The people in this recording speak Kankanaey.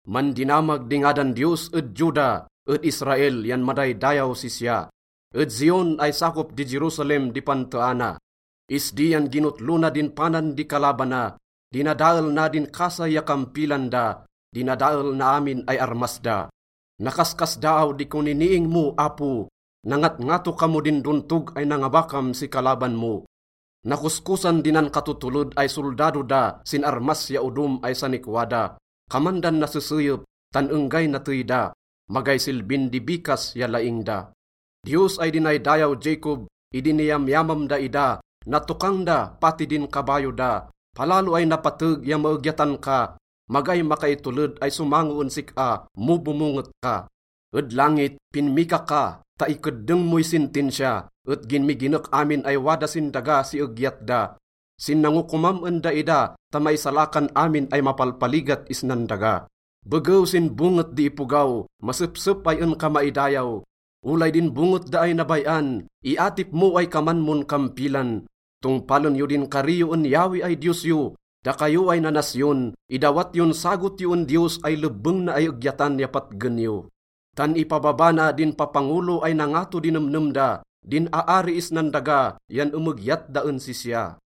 Mandinamag di ngadan Diyos ed Juda, ed Israel yan madaydayaw sisya. Ed Zion ay sakop di Jerusalem di panteana. Isdi yan ginotlo na din panan di kalabana. Dinadael na din kasay ya kampilan da, dinadael na amin ay armas da. Nakaskasdaaw di koniniing mo, Apo! Nangatngato ka mo din dontog ay nangabakam si kalaban mo. Nakoskosan di nankatotoled ay soldado da sin armas ya odom ay sanikwa da. Kaman dan naseseyep, tan enggay natey da, magay silbin di bikas ya laing da. Diyos ay dinaydayaw Jacob, idi niyamyamam daida, natokang da pati din kabayo da. Palalo ay napateg ya maegyatan ka, magay makaitoled ay somango en sik-a mo bomonget ka. Ed langit, pinmika ka ta ikeddeng moy sentensiya, et ginmiginek amin ay wada sin daga si egyat da, sin nangokomam en daida ta maisalakan amin ay mapalpaligat isnan daga. Begew sin bonget di ipogaw, masepsep ay en ka maidayaw. Olay din bonget da ay nabay-an, iatip mo ay kaman mon kampilan. Tongpalen yo din kari yo en Yahweh ay Diyos yo. Dakayo ay nanasyon, idawat yon sagot yo en Diyos ay lebbeng na ay egyatan ya patgen yo. Tan ipababa na din papangolo ay nangato di nemnem da, din aari isnan daga yan emegyat da en sisya.